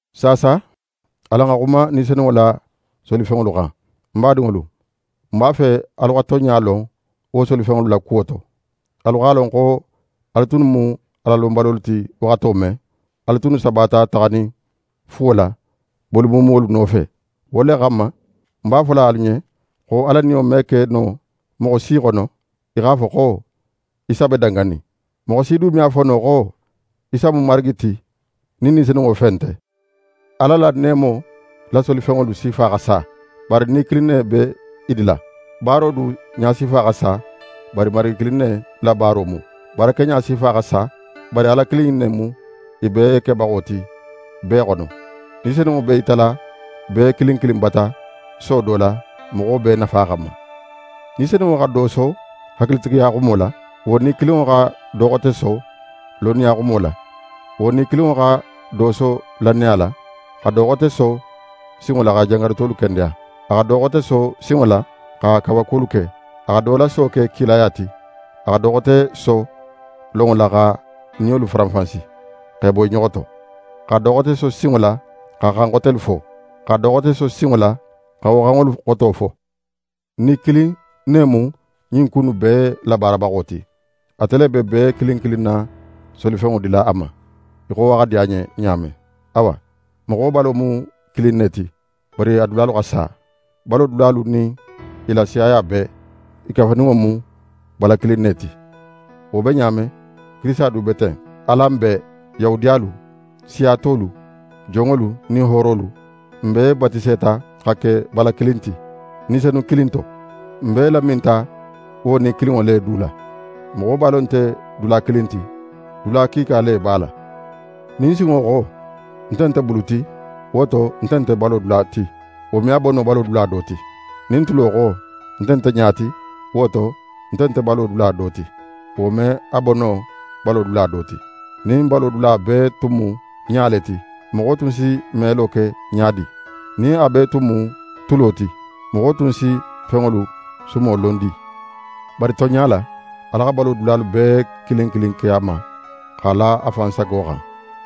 Saasa alan xa xuma Ni Senunŋo la solifenŋolu xan. Ń badinŋolu, ń b'a fe alu xa tonɲa lon wo solifenŋolu la kuwo to. Alu x'a lon xo alu tunnu mu Alalonbalolu ti waxato men, alu tunnu sabata taxanin fuwo la, boli muumuwolu nofe. Wo le xanma, ń b'a fola alu ɲen xo Ala Niyo me ke moxo si xono, í x'a fo xo: «Isa be danganin.» Moxo si du me a fo no xo: «Isa mu Marigi ti» nin Ni Senunŋo fe nte. Ala la neemo la solifenŋolu sifa xa sa; bari Ni kilin ne be i dila. Baaro du ɲasifa xa sa; bari Marigi kilin ne la baaro mu. Baarakeɲa sifa xa sa; bari Ala kilin in ne mu i bee kebaxo ti bee xono. Ni Senunŋo b'é yitala bee kilin kilin bata so do la, moxo bee nafa xanma. Ni Senunŋo xa do so hakilitigiya xumo la; wo Ni kilinŋo xa do xote so lonniya xumo la. Wo Ni kilinŋo xa do so lannaya la, xa do xote so sinŋo la xa jangarutolu kendeya. A xa do xote so sinŋo la xa kawakuwolu ke. A xa do la so ke kilaya ti. A xa do xote so lonŋo la xa niyolu faranfansi x'e bo i ɲoxo to, xa do xote so sinŋo la xa xan xotelu fo. A xa do xote so sinŋo la xa wo xanŋolu xoto fo. Ni kilin ne mu ɲin ku innu bee labaarabaxo ti. Ate le be bee kilin kilin na solifenŋo dila a ma, í xo a xa di a ɲen ɲa men. Awa, moxo balo mu kilin ne ti, bari a dulalu xa sa. Balo dulalu nin i la siyaya bee, i kafuninŋo mu bala kilin ne ti. Wo be ɲa men, Kirisita du be ten. Alan bee: Yahudiyalu, siya tolu, jonŋolu nin hoorolu, n bee batiseta xa ke bala kilin ti, Ni Senun kilin to. N bee laminta wo Ni kilinŋo le du la. Moxo balo nte dula kilin ti, dula kiika le b'a la. Nin sinŋo xo: «Nte nte bulu ti, wo to, nte nte balo dula ti.» Wo me a bo no balo dula do ti. Nin tulo xo: «Nte nte ɲa ti, wo to, nte nte balo dula do ti.» Wo me a bo no balo dula do ti. Nin balo dula bee tun mu ɲa le ti, moxo tun si melo ke ɲa di? Nin a bee tun mu tulo ti, moxo tun si fenŋolu sumo lon di? Bari tonɲa la, Ala xa balo dulalu bee kilin kilin ke a ma, x'a la a fan sago xan.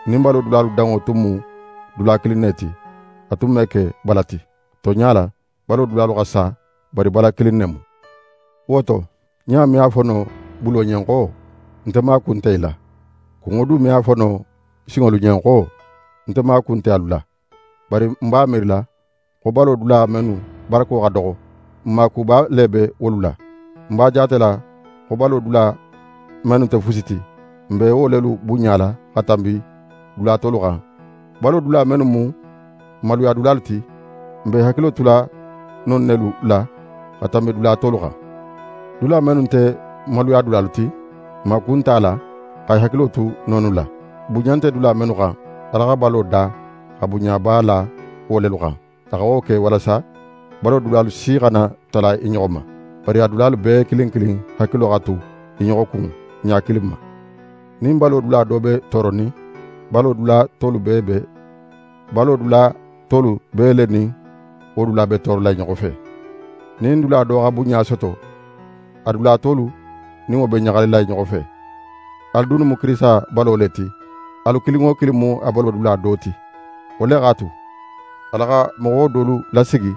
Nin balo dulalu danŋo tun mu dula kilin ne ti, a tun me ke bala ti. Tonɲa la, balo dulalu xa sa, bari bala kilin ne mu. Wo to, ɲa me a fo no bulo ɲen xo: «Nte maaku nte í la.» Kunŋo du me a fo no sinŋolu ɲen xo: «Nte maaku nte alu la.» Bari n b'a miirila xo balo dula mennu barako xa doxo, n maakuba le be wolu la. N b'a jaatela xo balo dula mennu nte fusi ti, n be wo lelu bunɲala xa tanbi dula tolu xan. Balo dula mennu mu n maluyadulalu ti, n be i hakilo tula non nelu la xa tanbi dula tolu xan. Dula mennu nte n maluyadulalu ti, n maaku nte a la xa i hakilo tu nonnu la. Bunɲa nte dula mennu xan, Ala xa balo da xa bunɲaba la wo lelu xan. A xa wo ke walasa balo dulalu si xana tala i ɲoxo ma, bari a dulalu bee kilin kilin hakilo xa tu i ɲoxo kun ɲa kilin ma. Nin balo dula do be tooronin, balo dula tolu bee le nin wo dula be toorola i ɲoxo fe. Nin dula do xa bunɲa soto, a dula tolu nin wo be ɲaxalila i ɲoxo fe. Alu dunnu mu Kirisita balo le ti, alu kilin wo kilin mu a balo dula do ti. Wo le x'a tu, Ala xa moxo dolu lasigi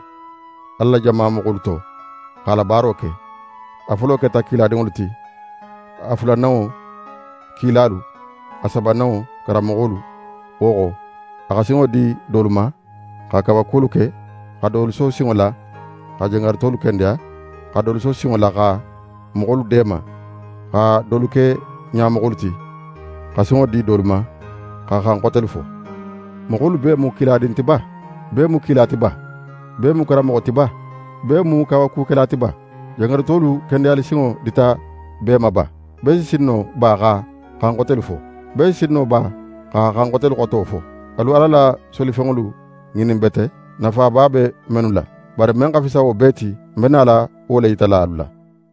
Ala la jama moxolu to, x'a la baaro ke. A folo keta kiladinŋolu ti; a fulananŋo, kilalu, a sabananŋo, karanmoxolu. Wo xo, a xa sinŋo di dolu ma xa kawakuwolu ke, xa dolu so sinŋo la xa jangarutolu kendeya, xa dolu so sinŋo la xa moxolu deema, xa dolu ke ɲamoxolu ti, xa sinŋo di dolu ma xa xan xotelu fo. Moxolu bee mu kiladin ti ba? Bee mu kila ti ba? Bee mu karanmoxo ti ba? Bee mu kawakukela ti ba? Jangarutolu kendeyalisinŋo dita bee ma ba? Bee si sin no ba xa xan xotelu fo? Bee si sin no ba xa xan xotelu xoto fo? Alu Ala la solifenŋolu ŋinin bete, nafaba be mennu la. Bari men xa fisa wo bee ti, ń be nala wo le yitala alu la.